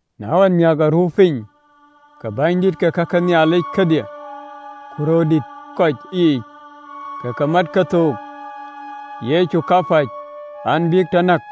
Na ɣɔn amiäk aruu piny, ke bänydït ke kake Nhialic kedhie ku röördït ë kɔc yiic ke ke mɛ̈t kethook Yecu kapäc an, bïk tɔ näk.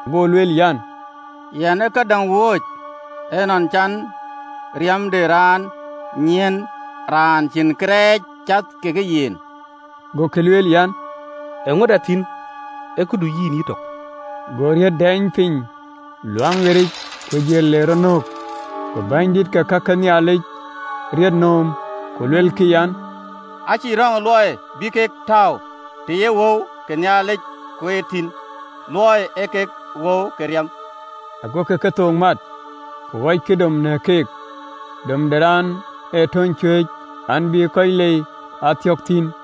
Go lueel an, “Yɛn ë këdäŋ wööc, ë luɔi cän riɛm de raan nyiɛɛn raan cïn kërɛɛc cath ke yen!” Gokï lueel an, “Eeŋöda thïn? Ee këdu yïn yïtök!” Go atek dɛɛny piny Luaŋdït yic, ku jël, le rɔt nöök. Go bänydït ke ka ke Nhialic riët nööm, ku luelkï an, “Acïkï röŋ ë luɔi bï ë ke tääu të ye wëu ke Luaŋdït kueet thïn, luɔi ee kek wëu ke riɛm.” Agokï kethook mat, ku ɣɔckï dom në keek, dom de raan ë töny cuëëc an, bï kɔc lei aa thiɔ̈k thïn.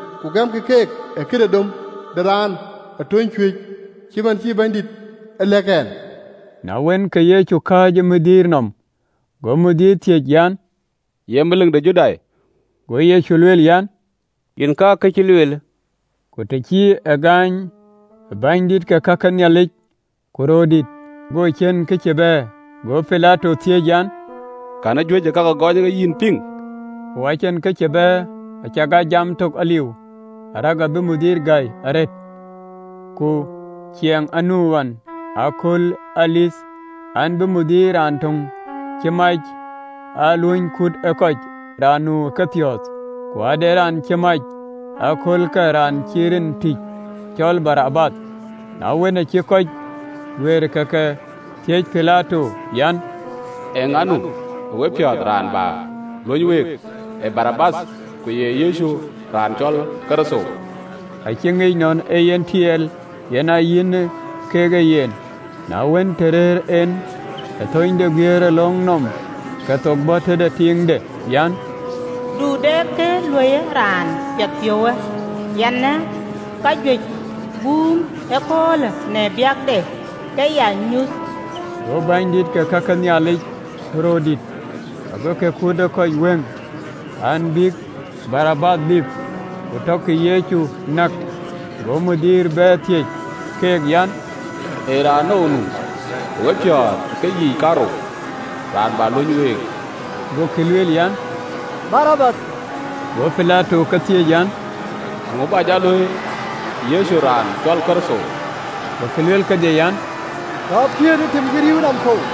ku gɛmkï keek ë këde dom de raan ë töny cuëëc, cït man cï Bɛ̈nydït e lɛ̈k ɛn.” Na wën, ke Yecu ë kääc ë bɛ̈ny nɔm, go bɛ̈ny thiëëc an, “Ye melik de Judai?” Go Yecu lueel an, “Yen ka kë cï lueelë.” Ku të cï e gaany ë bänydït ke ka ke Nhialic ku röördït, go ciën kë cï bɛ̈ɛ̈r. Go Pilato thiëëc an, “Kɛ̈në ë ka gɔɔny kek yïn piŋ?” Ku acïn kë cï bɛ̈ɛ̈r, acakaa jam tök aliu, arëk abï bɛ̈ny gäi arëët. Ku ciɛɛŋ aa nu ɣɔn ëköölë ë Dhuëëŋ an, bï bɛ̈ny raan töŋ cï mac aa luöny kut ë kɔc, raan nu ë kepiɔ̈ɔ̈th. Ku ade raan cï mac ë aköölkë raan cï rin tïc, cɔl Barabath. Na wën, aacï kɔc guiëër, ke ke thiëëc Pilato an, “Eeŋa nu ë wepiɔ̈ɔ̈th raan bä luöny week? Ee Barabath, ku ye Yecu, raan cɔl Kërtho?” Acï ŋic ëgɔk nɔn ee yen tiɛɛl yen ë yïn kek e yen. Na wën, të rëër en ë thööny de guiëërëlöŋ nɔm, ke thok bɔ̈ tëde tiiŋde an, “Du de kë luöiyë raan piɛthpiɔ̈uwë, yɛn ë kajuëc guum ëköölë në baŋde ke ya nyuöth.” Go bänydït ke ka ke Nhialic ku röördït agokï kut ë kɔc wëŋ an, bïk Barabath lip, ku tɔkï Yecu näk. Go bɛ̈ny bɛ̈ɛ̈r, thiëëc keek an, “Ee raanou nu ë wepiɔ̈ɔ̈th ë keyiic kaarou, raan bä luöny week?” Gokï lueel an, “Barabath.” Go Pilato ke thiëëc an, “Eeŋö bä jɔ luöi Yecu, raan cɔl Kërtho?” Gokï lueel kedhie an, “Tɔ piëëtë ë tim cï rïïu nɔm kɔ̈u!”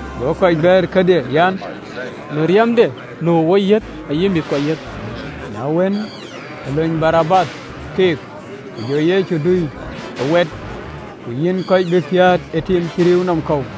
Go kɔc bɛ̈ɛ̈r kedhie an, “Në riɛmde nu ë woyiëth, ayï mïthkuɔ yiëth!” Na wën, ke luny Barabath keek, ku jɔ Yecu tɔ dui ë waat, ku yïn kɔc, bïk lɔ piäät ë tim cï rïïu nɔm kɔ̈u.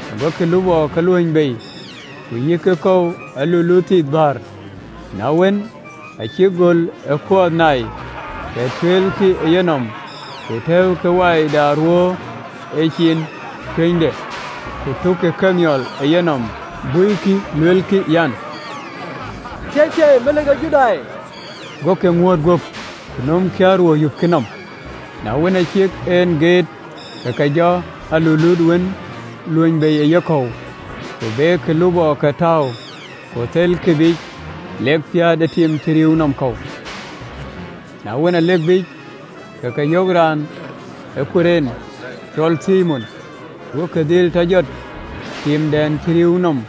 Gokï lupɔɔke luöny bei, ku yïkkï kɔ̈u alulut thith bäär. Na wën, aa cïk göl ë kuɔɔth nai, ke tueelkï ë yenɔm, ku tɛ̈ɛ̈ukï wai de aruöör ë ciin cuënyde, ku tukkï kemiɔl ë yenɔm, buikï, luelkï an, “Thieithieei, Melik de Judai!” Gokï ŋuööt guöp, ku nömkï aruöör, yupkï nɔm. Na wën, aa cïk en geet, ke ke jɔ alulut wën luöny bei ë yekɔ̈u, ku bekï lupɔɔke tääu, ku thelkï biic lek piäät ë tim cï rïïu nɔm kɔ̈u. Na wën, alek biic, ke ke yök raan ë Kurene, cɔl Thimon, gokï dhil tɔ jɔt timdɛn cï rïïu nɔm.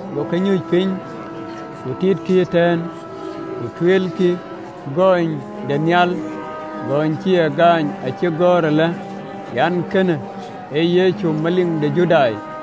Gokï nyuc piny, ku titkï ëtɛ̈ɛ̈n. Ku tueelkï gɔnyde nhial, gɔny cï ëye gaany, acï gɔ̈ɔ̈r alë an, “Kënë ee Yecu Melik de Judai.”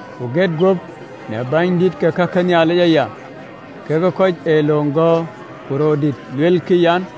Ku get guöp në bänydït ke kake Nhialic aya, kekë kɔc ee löŋ gɔ̈ɔ̈r ku röördït, luelkï an,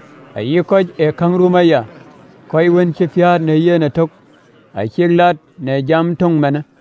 Ayï kɔc ë käŋ rum aya, kɔc wën cï piäät në yen ëtök, acïk lat në jam töŋ manë.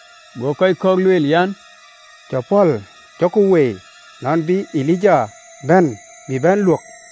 Go kɔc kɔ̈k lueel an, “Jɔ pɔ̈l, jɔku woi nɔn bï Elija bɛ̈n bï bɛ̈n luök!”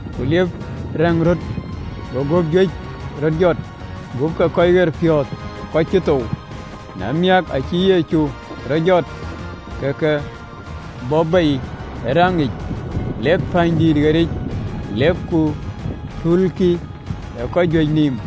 ku liep rɛ̈ŋ röt, go gup juëc röt jɔt, gup ke kɔc ɣerpiɔ̈ɔ̈th kɔc cï thou. Na wään cï Yecu rɔt jɔt, ke ke bɔ̈ bei ë rɛ̈ŋ yiic, lek pänydïït ɣeric lek ku tulkï ë kɔc juëc nïïm.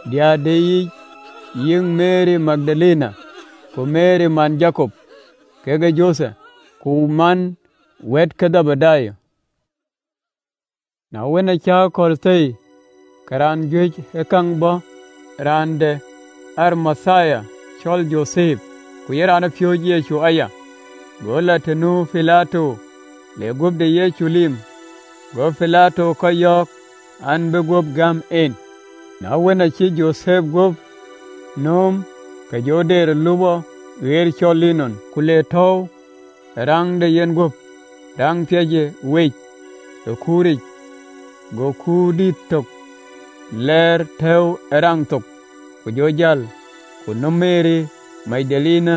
Diëër de yiic Meri Magdalene, ku Meri man Jakop kekë Jothep, ku man wɛ̈ɛ̈t ke Dhebedayo. Na wën, aacï akɔ̈l thëi, ke raan juëc ë käŋ bɔ̈, raan de Arimathia, cɔl Jothep, ku ye raanpiööcë Yecu aya. Go lɔ të nu Pilato, le guöp de Yecu lip. Go Pilato kɔc yɔ̈ɔ̈k an, bïï guöp gäm en. Na wën, aacï Jothep guöp nööm, ke jɔ deer ë lupɔ ɣer cɔl linɔn, ku le tɔ̈ɔ̈u ë raŋ de yenguöp, raŋ ë piɛc wec ë kuur lɔ giliu yic, go kuur dït tök lɔɔr tɛ̈ɛ̈u ë raŋ thok, ku jɔ jäl. Ku nu Meri Magdalene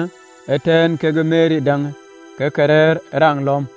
ëtɛ̈ɛ̈n, kekë Meri däŋ, ke ke rɛ̈ɛ̈r ë raŋ nɔm.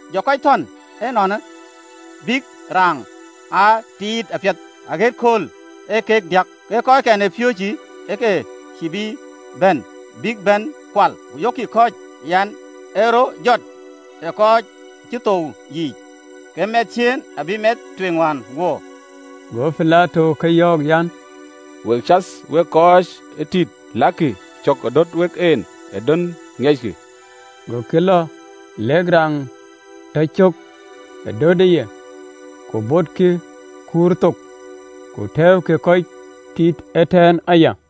Jɔ kɔc thɔn ënɔɔnë, bïk raŋ aa tiit apiɛth, aɣët kööl ee kek diäk, ke kɔckɛn ë piööcë ke ke cïï bï bɛ̈n, bïk bɛ̈n kual, ku yöökkï kɔc, an, “Ë rɔt jɔt ë kɔc cï thou yiic, ke mɛnh ciëën abï mɛth tueŋ wään wuöör.” Go Pilato ke yɔ̈ɔ̈k an, “Wek cath we kɔc ee tïït, lakï cök ë dɔ̈t wek en, ë dön ŋiɛckï.” Gokï lɔ, lek raŋ tɔ cök ë dötëye, ku botkï kuur thok, ku tɛ̈ɛ̈ukï kɔc ee tïït ëtɛ̈ɛ̈n aya.